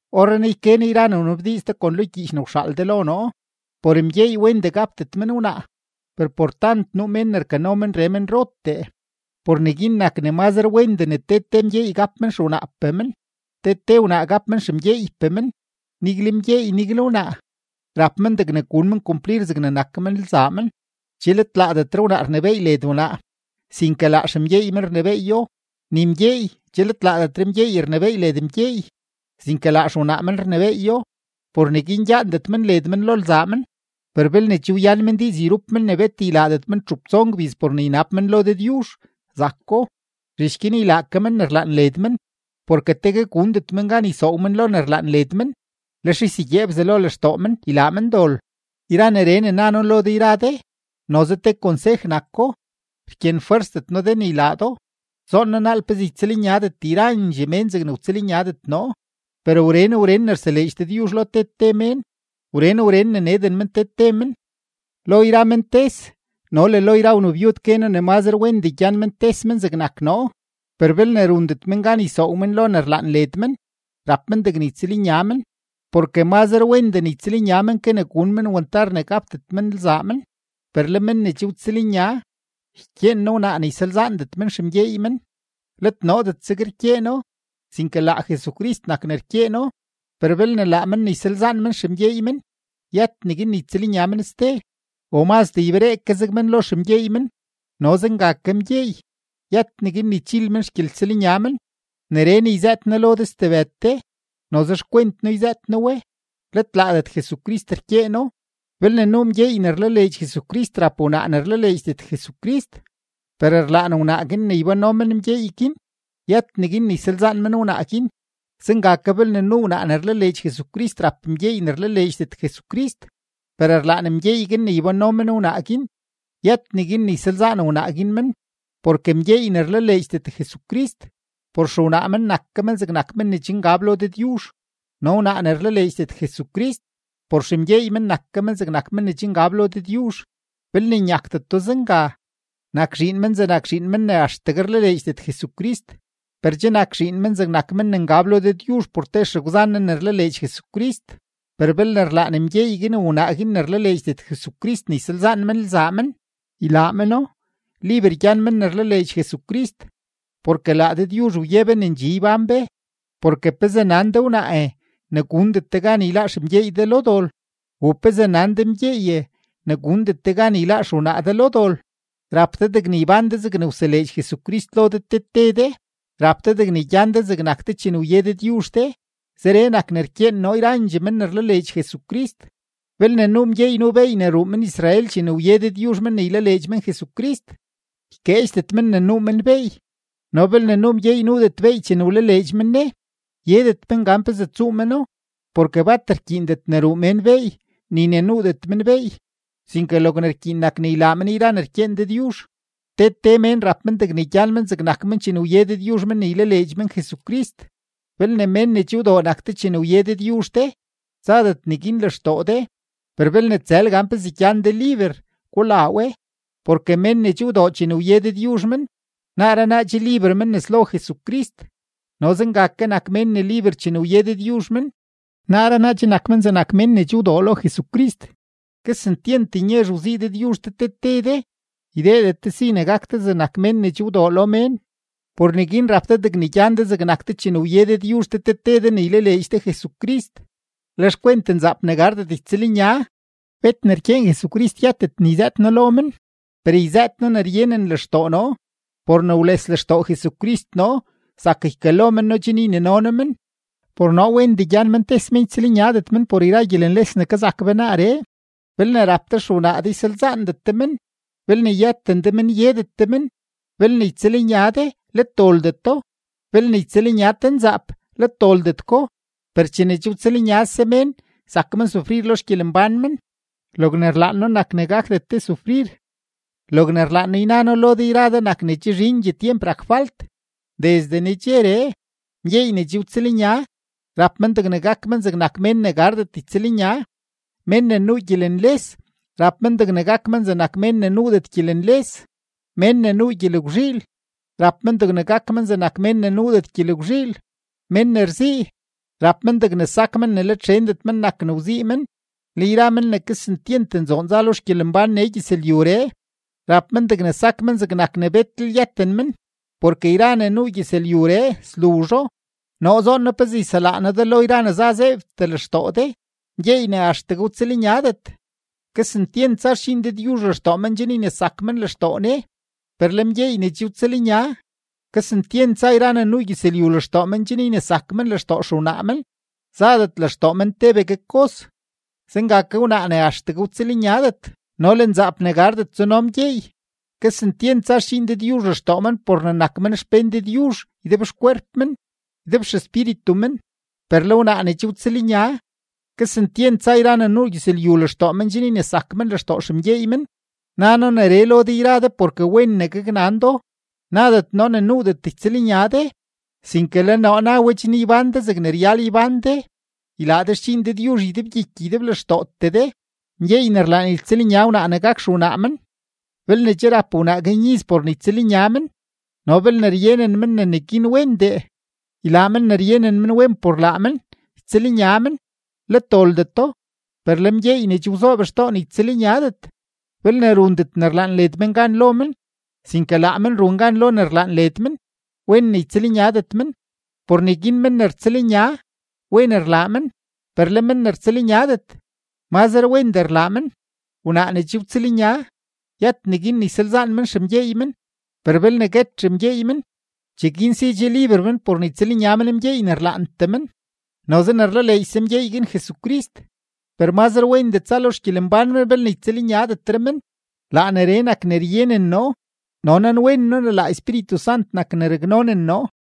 Orrenaa yke noo yra ne wnabdiiz de kon lo xgyiich de ne wxaal de lo noo. Por mgyeey wendee gapdet men wnaa, per por tant nuu mén ne rkano menree menrotee, por neguin nak ne mazre wendee ne te te mgyeey gap men xewnaapee men, te te wnaa gap men xemgyeeypee men. Nigle mgyeey, nigle wnaa, rap men degne gun men kumplir zegne nak men lzaa men. Che let laadetre wnaa rnebééy led wnaa, sinke laa xemgyeey men rnebééyo. Ni mgyeey che let laadetre mgyeey rnebééy led mgyeey, sinke laa xewnaa men rnebééyo. Por neguin gyaandet led men lo lzaa men, per belne che wyan men diiz yrup men ne bet ylaadet men txup tson gbiz por ne ynab men lo Dëdyuzh, zako; zhich guin ylaa ke men ne rlaan led men, porke tegue gundet men gan ysoow men lo ne rlaan led men, lex ysegyee Bzelo lextoo men ylaa men dol. Yra neree ne na noo lo de yra de, noze te konsej nako, rkyenfwersdet noo de ne ylaa do. Zoon noo naal pezee ytsëlnyadet yrandxee mén zegne wtsëlnyadet noo, per wren wren ne rseleedx Dëdyuzh lo te te mén, wren wren ne neden men te te men. Lo yra men tes no le lo yra wnabyud gue noo ne mazre wendee gyan men tes men zegnak noo. Per belne rundet men gan ysoow men lo ne rlaan led men, rap men degne ytsëlnya men, porke mazre wendee ne ytsëlnya men ke ne gun men wantar ne gapdet men lzaa men. Per le men ne che wtsëlnya, ykyeen noo wnaa ne ysalzaandet men xemgyeey men; let noodet zeg rkyeeno, sinke laa Jesucrist nak ne rkyeeno. Per belne laa men ne ysalzaan men xemgyeey men, yët neguin ne ytsëlnya men ste; o mazdee yberee ke zeg men lo xemgyeey men. No zenga ke mgyeey, yët neguin ne ychil men xgyeltsëlnya men. Neree ne yzëët noo lo de stebëd de, noze xkwent noo yzëët noo we, let laadet Jesucrist rkyeeno. Belne nuu mgyeey ne rlaleedx Jesucrist rap wnaa ne rlaleedxdet Jesucrist, per rlaan wnaa guin ne ybánno men mgyeey guin, yët neguin ne ysalzaan men wnaa guin. Zenga ke belne nuu wnaa ne rlaleedx Jesucrist rap mgyeey ne rlaleedxdet Jesucrist, per rlaan mgyeey guin ne ybánno men wnaa guin, yët neguin ne ysalzaan wnaa guin men. Porke mgyeey ne rlaleedxdet Jesucrist, por xewnaa men nak ke men zegnak men ne che ngab lo Dëdyuzh; no wnaa ne rlaleedxdet Jesucrist, por xemgyeey men nak ke men zegnak men ne che ngab lo Dëdyuzh. Belne nyakdeto zenga, nak zhiin men zegnak zhiin men ne axtegue rlaleedxdet Jesucrist, per che nak zhiin men zegnak men ne ngab lo Dëdyuzh por te xegwzan ne ne rlaleedx Jesucrist. Per belne rlaan mgyeey guin o wnaa guin ne rlaleedxdet Jesucrist ne ysalzaan men lzaa men, ylaa meno; liber gyan men ne rlaleedx Jesucrist, porke laa Dëdyuzh wye be ne ndxi ybán be. Porke ¿pezee nan de wnaae, ne gundet de gan yláá xemgyeey de lo dol? ¿U pezee nan de mgyeeye, ne gundet de gan yláá xewnaa de lo dol? Rap de degne ybán de zegne wseleedx Jesucrist lo de te te de, rap de degne gyan de zegnak de chene wye Dëdyuzh de; zeree nak ne rkyeen noo yrandxee men ne rlaleedx Jesucrist. Belne nuu mgyeey nuu beey ne ruu men-Israel chene wye Dëdyuzh men ne ylaleedx men Jesucrist, ykeedxdet men ne nuu men beey; no belne nuu mgyeey nuudet beey chene wlaleedx men Ne, yedet men gan pezee tsuu meno. Porke bat rkyiindet ne ruu mén beey ni ne nuudet men beey; sinke logne rkyiin nak ne ylaa men yra ne rkyeen Dëdyuzh. Te te mén rap men degne gyan men zegnak men chene wye Dëdyuzh men ne ylaleedx men Jesucrist. Belne mén ne che wdoo nak de chene wye Dëdyuzh de, tsadet neguin lextoo de. Per belne tsël gan pezee gyan de liber, gulaa we. Porke mén ne che wdoo chene wye Dëdyuzh men, naaree naa che liber men nes lo Jesucrist, no zenga ke nak mén ne liber chene wye Dëdyuzh men, naaree naa che nak men zegnak mén ne che wdoo lo Jesucrist. Kesentyent nyezh wzii Dëdyuzh de te te de; ydeedet de si ne gak de mén ne che wdoo lo mén. Por neguin rap de degne gyan de zegnak de chene wye Dëdyuzh de te te de ne ylaleedx de Jesucrist. Le xkwent nzaap ne gardet ytsëlnya, bet ne rkyeen Jesucrist yëtet ne yzëët noo lo men, per yzëët noo ne ryenen lextoo noo. Por ne wles lextoo Jesucrist noo zak ykalo men noo chen ynino noo men. Por noo wendee gyan men tes men ytsëlnyadet men por yra gyelenles ne kazak be naaree. Belne rap de xewnaa de, ysalzaandet de men; belne yëten de men, yedet de men. Belne ytsëlnya de, let doldeto; belne ytsëlnya te nzaap, let doldet ko. Per chene che rtsëlnyase mén, zak men sufrir lo xgyelembán men; logne rlaan noo nak ne gakdet de sufrir. Logne rlaan noo yna noo lo de yra de nak ne che zhindxee tyemp rak falt. Desde nedxeree, mgyeey ne che wtsëlnya, rap men degne gak men zegnak mén ne gardet ytsëlnya; mén ne nuu gyelenles, rap men degne gak men zegnak mén ne nuudet gyelenles; mén ne nuu gyelgwzhiil, rap men degne gak men zegnak mén ne nuudet gyelgwzhiil; mén ne rzii, rap men degne sak men ne let xendet men nak ne wzii men; le yra mén ne kesentyent nzoon za lo xgyelembán nee gyëzlyuree, rap men degne sak men zegnak ne betlel yëten men, porke yra ne nuu gyëzlyuree sluzho. Noo zoon noo pezee yselaa noo de lo yra ne za zeebtee lextoo de. Mgyeey ne axtegue wtsëlnyadet, kesentyent za xdxiin Dëdyuzh lextoo men chen ynesak men lextoo Ne; per le mgyeey ne che wtsëlnya, kesentyent za yra ne nuu gyëzlyu lextoo men chen ynesak men lextoo xewnaa men, zadet lextoo men tebegue kos. Zenga ke wnaa ne axtegue wtsëlnyadet no le nzaap ne gardet tsuno mgyeey, kesentyent za xdxiin Dëdyuzh lextoo men por ne nak men xpén Dëdyuzh ydebxkwerp men, ydebxespíritu men; per le wnaa ne che wtsëlnya, kesentyent za yra ne nuu gyëzlyu lextoo men chen ynesak men lextoo xemgyeey men. Na noo neree lo de yra de porke wen ne gaknan do, nadet noo ne nuudet ytsëlnya de, sinke le noo na we chen ybán de zegne ryal ybán de, ylaa de xdxiin Dëdyuzh ydebgyiky ydeblextootee de. Mgyeey ne rlaan ytsëlnya wnaa ne gak xewnaa men, belne che rap wnaa guin iz por ne ytsëlnya men no belne ryenen men ne neguin wendee, ylaa men ne ryenen men wen por laa men, ytsëlnya men; let doldeto. Per le mgyeey ne che wzoob xtoo ne ytsëlnyadet, belne rundet ne rlaan led men gan lo men, sinke laa men run gan lo ne rlaan led men, wen ne ytsëlnyadet men. Por neguin men ne rtsëlnya, wen rlaa men, per le men ne rtsëlnyadet, mazre wendee rlaa men. Wnaa ne che wtsëlnya, yët neguin ne ysalzaan men xemgyeey men, per belne guet xemgyeey men, cheguin si che liber men por ne ytsëlnya men mgyeey ne rlaantee men, noze ne rlaleedxse mgyeey guin Jesucrist. Per mazre wendee tsa lo xgyelembán men belne ytsëlnyadetre men. Laa neree nak ne ryenen noo, no nanwen noo ne laa Espíritu Sant nak ne raknonen noo.